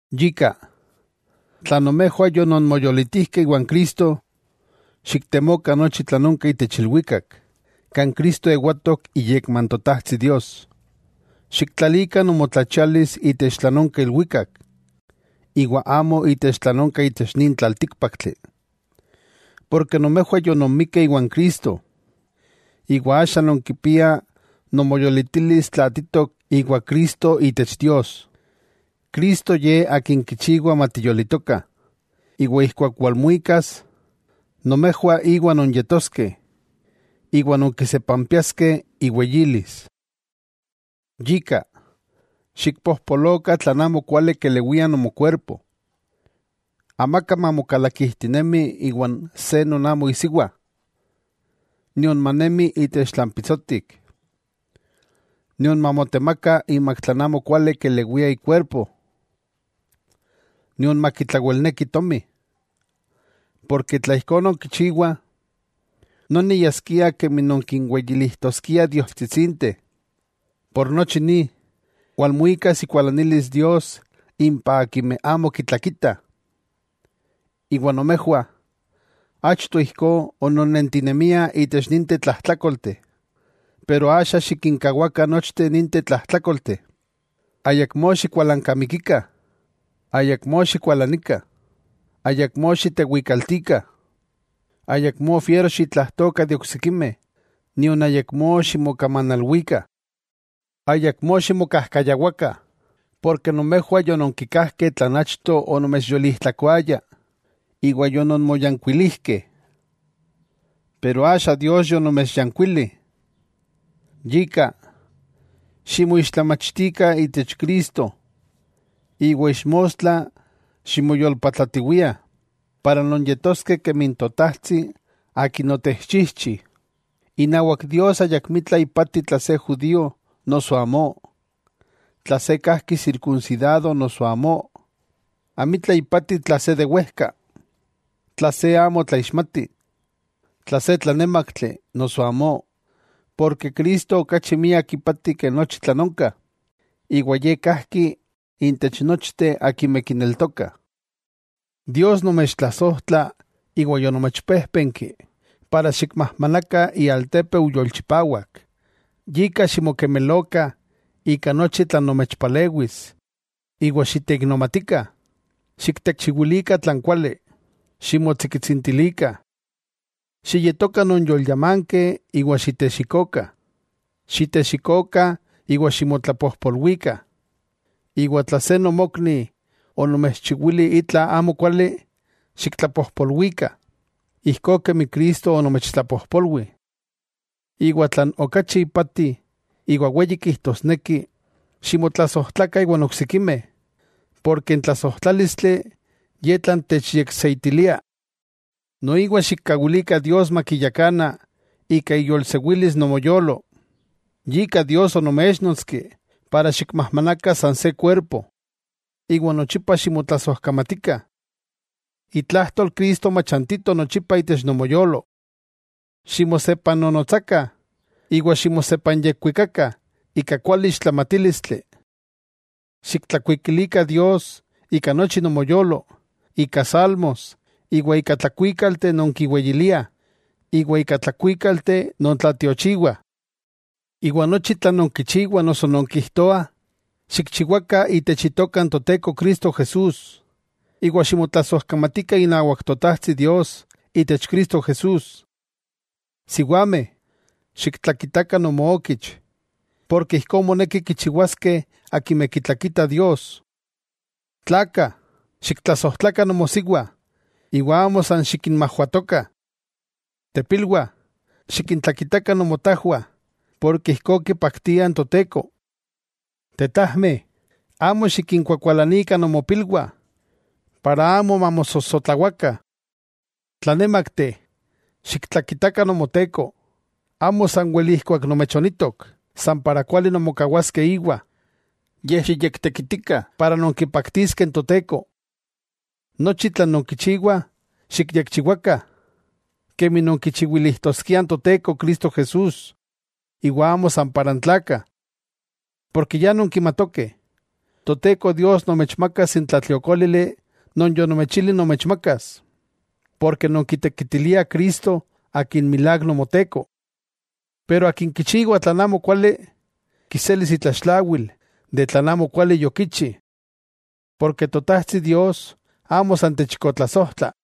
Yika, tla nomejwah yononmoyolitijkeh iwan Cristo, xiktemokah nochi tlan onka itech ilwikak, kan Cristo ewatok iyekma n Totajtsi Dios. Xiktlalikah nomotlachialis itech tlan onka ilwikak, iwa amo itech tlan onka itech nin tlaltíkpaktli. Porke nomejwah yononmikeh iwan Cristo, iwa axa nonkipiah nomoyolitilis tlaatitok iwa Cristo itech Dios. Cristo Ye Akin kichiwa matiyolitokah, iwa ijkuak walmuikas, nomejwah íwa nonyetoskeh, iwa nonkisepampiaskeh iweyilis. Yika, xikpojpolokah tlan amo kuali kelewia nomokuerpo. Amaka mamokalakijtinemi iwan se non amo isiwa, nion manemi itech tlan pitsotik, nion mamotemaka imak tlan amokuali kelewia ikuerpo, nion makitlawelneki tomi, porke tla ijkó nonkichiwah, noni yaskia kemi nonkinweyilijtoskiah diostsitsinteh. Por nochi ni, walmuikas ikualanilis Dios impah akimeh amo kitlakitah. Iwa nomejwah, achto ijkó ononnentinemiah itech ninteh tlajtlákolteh. Pero axa xikinkawakah nochteh ninteh tlajtlákolteh: Ayakmó xikualankamikikah, ayakmó xikualanikah, ayakmó xitewikaltikah, ayakmó fiero xitlajtokah de oksikimeh, nion ayakmó ximokamanalwikah. Ayakmó ximokajkayawakah, porke nomejwah yononkikajkeh tlan achto onomechyolijtlakoaya iwa yononmoyankuilijkeh. Pero axa Dios yonomechyankuili. Yika, ximoixtlamachtikah itech Cristo iwa ixmostla ximoyolpatlatiwiah para nonyetoskeh kemi n Totajtsi Akin otechchijchi. Inawak Dios ayakmitla ipati tla se judío noso amó, tla se kajki sirkunsidado noso amó. Amitla ipati tla se de wejka, tla se amo tlaixmati, tla se tlanémaktli noso amó. Porke Cristo okachi miak ipati ke nochi tlan onka, iwa Ye kajki intech nochteh akimeh kineltokah. Dios nomechtlasojtla iwa yonomechpéjpenki para xikmajmanakah ialtépeu yolchipawak, yika ximokemelokah ika nochi tlan nomechpalewis iwa xiteiknomatikah, xiktechiwilikah tlan kuali, ximotsikitsintilikah, xiyetokah nonyolyamankeh iwa xitexikokah. Xitexikokah iwa ximotlapojpolwikah. Iwa tla se nomokni onomechchiwili itla amo kuali, xiktlapojpolwikah, ijkó kemi Cristo onomechtlapojpolwi. Iwa tlan okachi ipati, iwa weyi kijtosneki: ximotlasojtlakah iwan oksikimeh, porke n tlasojtlálistli, ye tlan techyekseitilia. Noiwa xikkawilikah Dios makiyakana ika iyolsewilis nomoyolo, yika Dios onoméchnotski para xikmajmanakah san se kuerpo. Iwa nochipa ximotlasojkamatikah. Itlajtol Cristo machantito nochipa itech nomoyolo. Ximosepannonotsakah iwa ximosepanyekuikakah ika kuali ixtlamatílistli. Xiktlakuikilikah Dios ika nochi nomoyolo ika salmos iwa ika tlakuíkalteh non kiweyiliah, iwa ika tlakuíkalteh non tlatiochiwah. Iwa nochi tlan nonkichiwah noso nonkijtoah, xikchiwakah itech Itoka n Toteko Cristo Jesús, iwa ximotlasojkamatikah inawak Totajtsi Dios itech Cristo Jesús. Siwameh, xiktlakitakah nomookich, porke ijkó moneki kichiwaskeh akimeh kitlakitah Dios. Tlakah, xiktlasojtlakah nomosiwa iwa amo san xikinmajwatokah. Tepilwah, xikintlakitakah nomotajwah porke ijkó kipaktia n Toteko. Tetajmeh, amo xikinkuakualanikah nomopilwah, para amo mamosojsotlawakah. Tlanémakti, xiktlakitakah nomoteko, amo sanwel ijkuak nomechonitok, san para kuali nonmokawaskeh iwa, yej xiyektekitikah para nonkipaktiskeh n Toteko. Nochi tlan nonkichiwah, xikyekchiwakah, kemi nonkichiwilijtoskiah n Toteko Cristo Jesús iwa amo san para n tlakah. Porke ya nonkimatokeh, Toteko Dios nomechmakas n tlatliokólili non yonomechili nomechmakas. Porke nonkitekitiliah Cristo akin milák Nomoteko. Pero akin kichiwa tlan amokuali, kiselis itlaxtlawil de tlan amokuali yokichi. Porke Totajtsi Dios amo san techikotlasojtla.